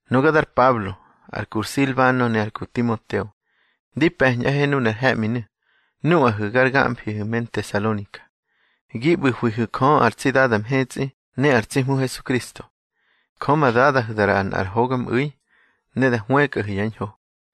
Nuga dar Pablo, ar ku Silbano ne ar ku Timoteo, di pe̱ñꞌahe nunar he̱ꞌminu̱ nuꞌahu̱ gar gamfihu̱ me Ntesalonika, gi ꞌbu̱hwihu̱ Jö ar tsi Dada mhetsꞌi ne ar tsi Hmu Hesukristo. Jö ma Dadahu̱ da ꞌraꞌahu̱ nꞌar hogamꞌu̱i ne da hwëkꞌahu̱ yá ñho.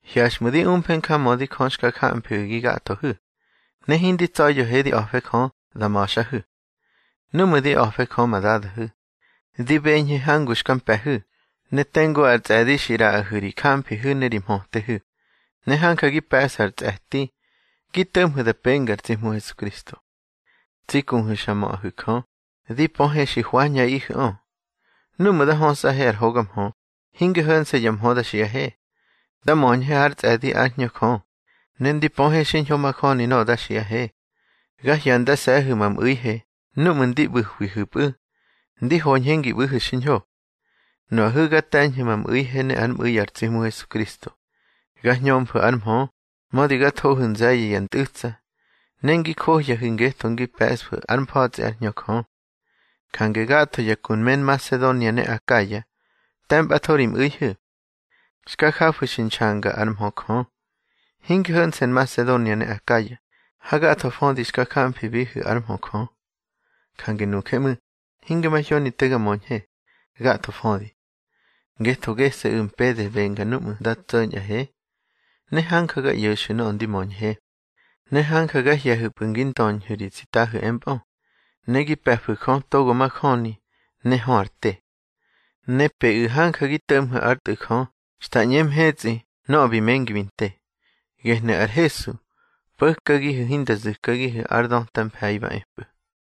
Hyaxꞌmu̱ di umfe njamödi Jö xka jamfihu̱ gi gathohu̱, ne hindi tsa̱ya̱he di a̱fe Jö da ma̱xꞌahu̱. Núꞌmu̱ di a̱fe Jö ma Dadahu̱, di beñhe hangu xka mpe̱hu̱, ne tengu ar tsꞌe̱di xi ꞌraꞌahu̱ ri jamfihu̱ ne ri mhötehu̱, ne hanja gi pe̱ꞌsu̱ ar tsꞌe̱ti gi to̱ꞌmhu̱ da penga ar tsi Hmu Hesukristo. Tsi kuhu̱ xa möꞌahu̱ Jö, di pöhe xi hwañꞌaꞌihu̱ꞌö. Núꞌmu̱ nda hösꞌahe ar hoga mhö, hinge ho̱nse̱ ya mhö da xiꞌahe. Da möñhe hár tsꞌe̱di ár Hñö Jö, ne ndi pöhe xiñho majöni nöꞌö da xiꞌahe. Ga hyandase̱hu̱ ma mꞌu̱ihe núꞌmu̱ ndi ꞌbu̱hwihu̱pꞌu̱ ndi hoñhe ngi ꞌbu̱hu̱ xiñho. Nuꞌahu̱ ga te̱ñhu̱ ma mꞌu̱ihe ne ár mꞌu̱i ar tsi Hmu Hesukristo. Ga hñömfu̱ ár mhö, mödi ga thohu̱ nze̱ye̱ ya ntꞌu̱tsa. Ne ngi johyahu̱ ngetho ngi pe̱ꞌsfu̱ ár mfa̱tsꞌi ár Hñö Jö. Jange gatho ya ku me Nmasedonia ne Akaya te̱mpꞌatho ri mꞌu̱ihu̱. Xka jafu̱ xi nxanga ár mhö Jö, hinge ho̱nse̱ Nmasedonia ne Akaya, hagatho födi xka jamfibihu̱ ár mhö Jö. Jange nuje ꞌmu̱, hinge mahyoni te ga möñhe, gatho födi. Ngetho gese̱ꞌu̱ mpede benga núꞌmu̱ nda tso̱ñꞌahe, ne hanja ga ꞌyo̱xu̱ nöꞌö ndi möñhe. Ne hanja ga hye̱hu̱pꞌu̱ ngi ndöñhu̱ ri tsitahu̱ empꞌö, ne gi pe̱fu̱ Jö togo majöni ne hö ar te. Ne peꞌu̱ hanja gi to̱ꞌmhu̱ ár Tꞌu̱ Jö xta ꞌñe mhetsꞌi nöꞌö bi mengi bi nte. Gehnu̱ ar Hesu po̱kagihu̱ hinda zu̱kagihu̱ ar döta mfe̱i ba epꞌu̱.